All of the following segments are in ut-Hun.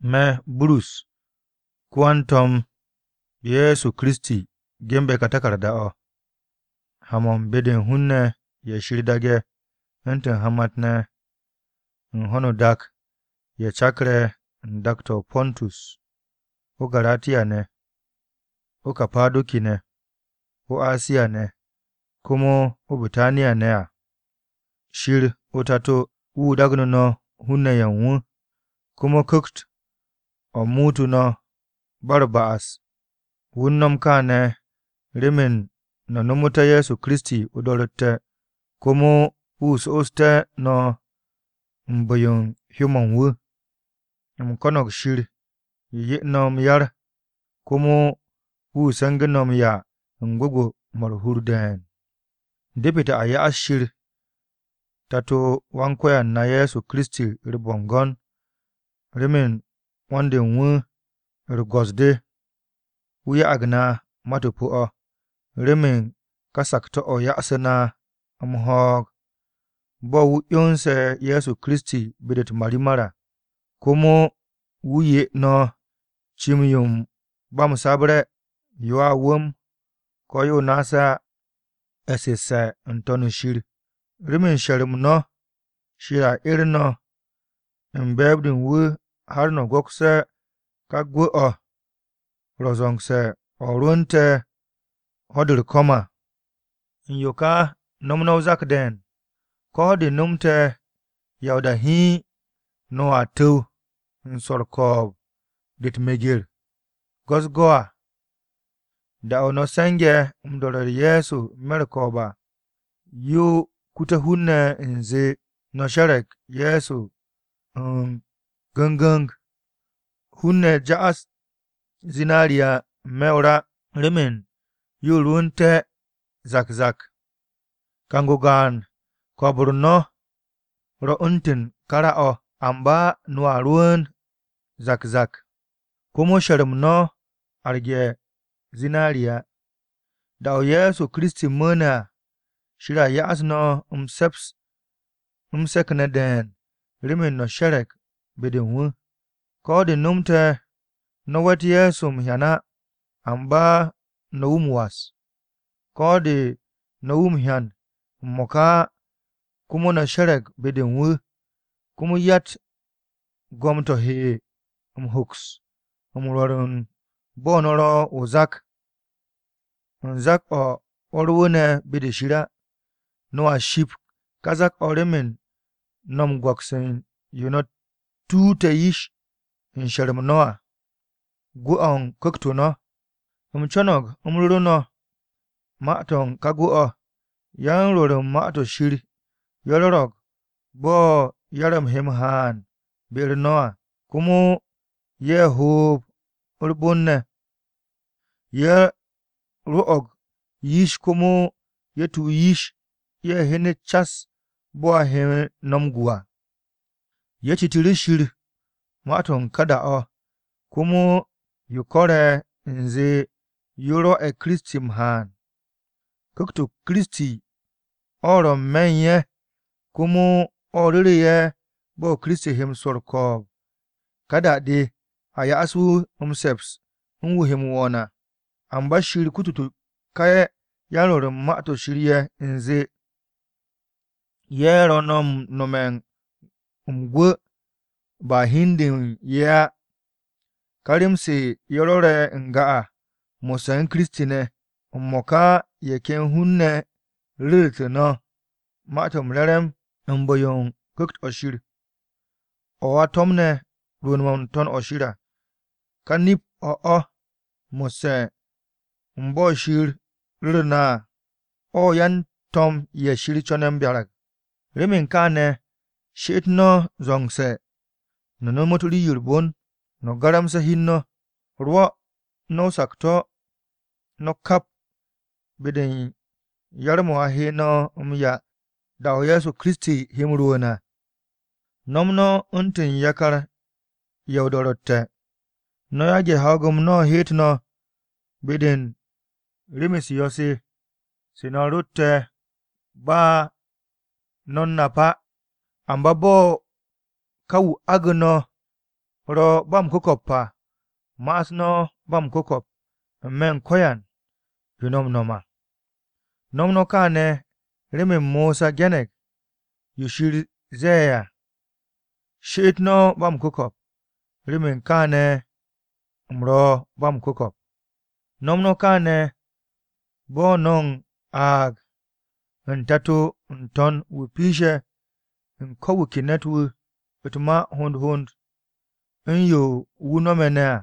Me̱, Bitrus, ko-yan-To̱m Ye̱soKiristi, ge̱nbe̱ ka taku̱rda-o̱, Ha-mo̱ u̱n be-de u̱n hun-ne̱ ye̱ Shir daage̱ u̱ntu̱n hamat-ne̱ u̱n ho̱no o-dak ye̱ cakre̱ u̱n dak-to̱ o-Pantus, o-Garatiya ne̱, o-Kapado̱ki ne̱, o-Asiya ne̱ komo o-Bitaniya ne̱ à. Shir o-Tato, wu̱ dagnu̱ no̱ hun-ne̱ ye̱ u̱n wu̱, komo Ku̱kt-o̱ muutu̱ no̱ ba u̱r-ba'as. Wu̱ u̱n no̱m kaane̱ remen no̱ nomoté̱ Ye̱so Kiristi o-do̱ro̱tte̱ komo wu̱ so'osté̱ no̱ u̱n bu̱-yo u̱n hyó-mo̱ u̱n wu̱. U̱m ko̱no̱g Shir 'ye no̱ m-yar, komo wu̱ se̱ngu̱ no̱ m-'ya u̱n gwu̱gwu̱-mo̱ u̱r-hur de̱e̱n. Depete̱ a ya'as Shir Tato-o Wan-Ko̱yan na Ye̱so Kiristi u̱r-bo̱ngo̱n remen 'wo̱n-de u̱n wu̱ u̱r-go̱s-de. Wu̱ ya'ag na mat-o pu̱-o̱ remen ka sakto̱-o̱ o̱ ya'asu̱ na m-ho̱o̱g à, bo̱ wu̱ 'yonse̱ Ye̱so Kiristi be-de u̱t-marimar à. Komo wu̱ 'ye no̱ cim-yo u̱n ba m-sabre̱, yo a wu̱m ko̱ yo naase̱ á, e̱ssu̱sse̱ n-To̱n shir. Remen she̱r-m no̱, Shir a 'er no̱ u̱n be̱e̱b-de u̱n wu̱ har no̱ go̱kste̱ ká gwu̱-o̱ ro̱ zo̱ngse̱ o̱ rwu̱u̱nte̱ ho̱-de u̱r-ko̱m à. U̱n yo ka no̱m no̱ o-zak de̱e̱n, ko̱ de nomte̱, ya o-da hiin no̱a tu̱w u̱n swo̱ u̱r-ko̱o̱b de u̱t-meger go̱-u̱s-go̱ à. Da-o̱ no̱ se̱nge̱ m-do̱re̱ Ye̱so n-me̱ u̱r-ko̱o̱b à, yo kute̱ hun-ne̱ u̱nze no̱ she̱re̱g Ye̱so gu̱n gu̱n. Hun-ne̱ m-zwo̱ u̱n zinariya n-me̱ o-ra remen ye̱ rwu̱u̱nté̱ kar kar. Kang-o gaan, ko̱o̱b-u̱r no̱ ro̱ u̱ntu̱n ka ra-o̱, amba no̱a rwu̱u̱n kar kar, komo she̱r-m no̱ aragte̱ zinariya. Da-o̱ Ye̱so Kiristi mu̱u̱ne̱ à, Shir a m-se̱ps no̱ wu̱ 'ye no̱ m-se̱k de̱e̱n remen no̱ she̱re̱g be-de u̱n wu̱. Ko̱ de nomte̱ no̱ we̱t Ye̱so m-hyan á, amba no̱ wu̱ m-was. Ko̱ de no̱tte̱ wu̱ m-hyan m-mo̱ka á, komo no̱ she̱re̱g be-de u̱n wu̱. Komo yatt gom-to̱ he m-hoks m-rwo̱r bo̱ no̱ ro̱ o-zak, u̱n zak-o̱ rwu̱u̱ne̱ be-de Shir á. No̱a ships ka zak-o̱ remen no̱ m-go̱ks u̱n yo no̱ tuute̱ yish u̱n she̱r-m no̱ à, gwu̱-o̱ u̱n ku̱kt-o no̱. U̱m co̱no̱g m-ru̱ru̱ no̱ ma-to̱ ka gwu̱-o̱. Yan-rwo̱r u̱n Ma-to̱ Shir ye̱ rwo̱ro̱g bo̱ yar-m he m-haan be-u̱r no̱ à, komo ye̱ hoob u̱r-bon ne̱. Ye̱ rwo̱'o̱g yish komo ye̱ tu yish, ye̱ hyenet cas bo̱ a he no̱ m-gu à. Ye̱ citu̱ru̱ Shir ma-to̱ u̱n ka da-o̱ komo yo ko̱re̱ u̱nze yo rwo̱'e̱ Kiristi m-haan. Ku̱kt-o Kiristi o̱ ro̱ n-me̱ u̱n ye̱, komo o̱ ru̱re̱ ye̱ bo̱ Kiristi he m-swo̱ u̱r-ko̱o̱b ka da-de ne̱ a 'ye wu̱ m-se̱ps mo̱ he m-do̱nd à. Amba Shir kutute̱ ká yan-Rwo̱r u̱n Ma-to̱ Shir ye̱ u̱nze, ye̱ ro̱ no̱ m-nome̱ m-gu̱w ba hi u̱n de u̱n ye̱ á. Ka rem-se ye̱ rwo̱re̱ n-ga à mo̱sse̱ u̱n Kiristi ne̱, m-mo̱ka ye̱ ken hun-ne̱ ye̱ ru̱ru̱tu̱ no̱ Ma-to̱ m-Re̱re̱m u̱n bu̱-yo u̱n Ku̱kt-o̱ Shir, o̱ a to̱mne̱ rwu̱u̱n-mo̱ n-To̱n u̱n shir à. Ka nip-o̱ o̱ mo̱sse̱ u̱n bo̱ Shir ruru na ne̱ à, o̱ yan-to̱m ye̱ Shir co̱ne̱ m-byarag à. Remen kaane̱, she'et no̱ zo̱ngse̱ no̱ nomot rii-yo u̱r-bon, no̱ garamse̱ hi u̱n no̱. Rwo̱ no̱ sakto̱-o no̱ kap be-de u̱n yar-mo̱ a he no̱ m-'ya da-o̱ Ye̱so Kiristi he m-rwu̱u̱n à. No̱m no̱ u̱ntu̱n yakar-ye̱ o-do̱ro̱tte̱. No̱ yage̱ ho̱o̱g-m no̱ heet no̱ be-de u̱n rem-u̱s yo̱-se se no̱ rotte̱ ba no̱ u̱n nap á. Amba bo̱ ká wu̱ agu̱ no̱ ro̱ ba m-ku̱ko̱p à, ma'as no̱ ba m-ku̱ko̱p n-me̱ u̱n ko̱yan yo no̱ m-no̱m à. No̱m no̱ kaane̱ remen Mosa ge̱ne̱g yo Shir ze̱e̱ à: “She'et no̱ ba m-ku̱ko̱p, remen kaane̱ u̱m ro̱ ba m-ku̱ko̱p.” No̱m no̱ kaane̱ bo̱ no̱ u̱n aag u̱n Tato-o̱ n-To̱n wan-piishe̱ u̱n ko wu̱ ke ne̱t-wu̱ u̱t-ma hond hond u̱n yo wu̱ no̱me̱ ne̱ à.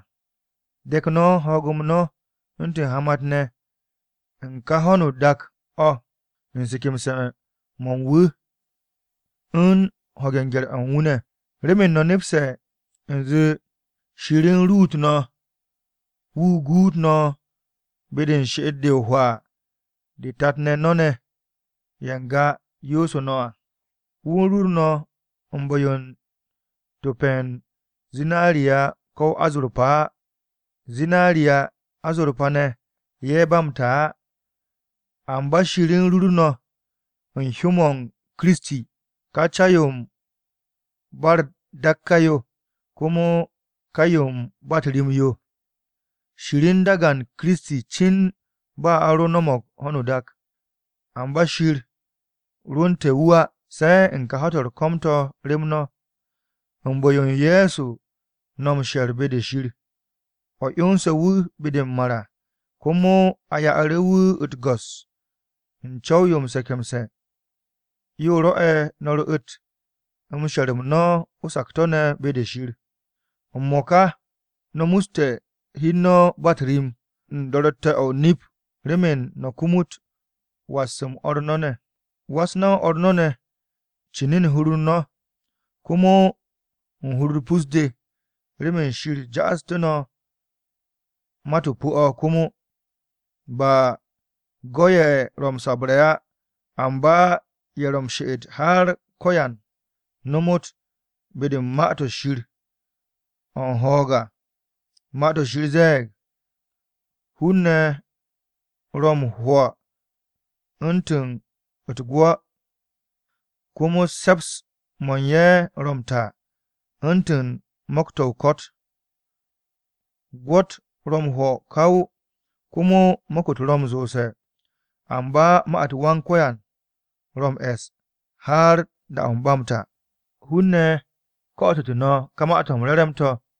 De̱k no̱ ho̱o̱g-m no̱ u̱ntu̱n hamat-ne̱ u̱n kà ho̱no o-dak o̱ u̱n se̱ke̱mse̱-mo̱ u̱n wu̱ u̱n ho̱ge̱ u̱n gye̱r-o̱ u̱n wu̱ ne̱. Remen no̱ nepse̱ u̱nze Shir u̱n rur no̱ remen wu̱ guut no̱ be-de u̱n she'et-de o-hwaa de tat-ne̱ no̱ ye̱ n-ga yoosu̱ no̱ à. Wu̱ u̱n rur no̱ u̱n bu̱-yo u̱n top-o̱ u̱n zinariya ko̱ azorpa á. Zinariya, azorpa ne̱, ye̱ ba m-ta á. Amba Shir u̱n rur no̱ u̱n hyó-m Kiristi, ka ca-yo u̱n ba u̱r-dakka yo komo ka yo u̱n ba u̱t-ri'in yo. Shir u̱n dagan Kiristi cin ba a ro no̱mo̱g ho̱no o-dak. Amba Shir rwu̱u̱nte̱ wu̱ á, se̱ u̱n ka ho̱-to̱ u̱r-ko̱m to̱ rem no̱. U̱n bu̱-o Ye̱so no̱ m-she̱r be-de Shir, o̱ 'yonse̱ wu̱ be-de m-mar à, komo a ya'u̱ru̱ wu̱ u̱t-go̱s u̱n co̱w-yo m-se̱ke̱mse̱. Yo rwo̱'e̱ no̱ ru̱'u̱t she̱r-m no̱ o-sakto̱ ne̱ be-de Shir. M-mo̱ka no̱ muste̱ hi u̱n no̱ ba u̱t-ri'in u̱n do̱ro̱tte̱-o̱ o-nip remen no̱ kumut was-m o̱r no̱ ne̱. Was no̱ o̱r no̱ ne̱ cin u̱n hur-u̱r no̱, komo u̱n hur-u̱r pus-de ne̱. Remen Shir ja'astu̱ no̱ mat-o pu̱-o̱ komo, ba u̱n go̱-ye̱ ro̱ m-sabre̱ á, amba ye̱ ro̱ m-she'et har ko̱yan nomot be-de u̱n Ma-to̱ Shir o̱ u̱n ho̱o̱g à. Ma-to̱ Shir ze̱e̱g, “Hun-ne̱ ro̱ m-'hwo̱ u̱ntu̱ u̱t-gwo̱, komo se̱ps-mo̱ u̱n ye̱ ro̱ m-ta u̱ntu̱n mo̱k-to̱ o-ko̱t. Gwo̱-u̱t ro̱ m-'hwo̱ kaw, komo mo̱k-u̱t ro̱ m-zoose̱. Amba ma-u̱t Wan-Ko̱yan ro̱ m-e̱s har da-o̱ ba m-ta.” Hun-ne̱ ko̱'o̱tu̱tu̱ no̱ ka Ma-to̱ m-Re̱re̱m to̱.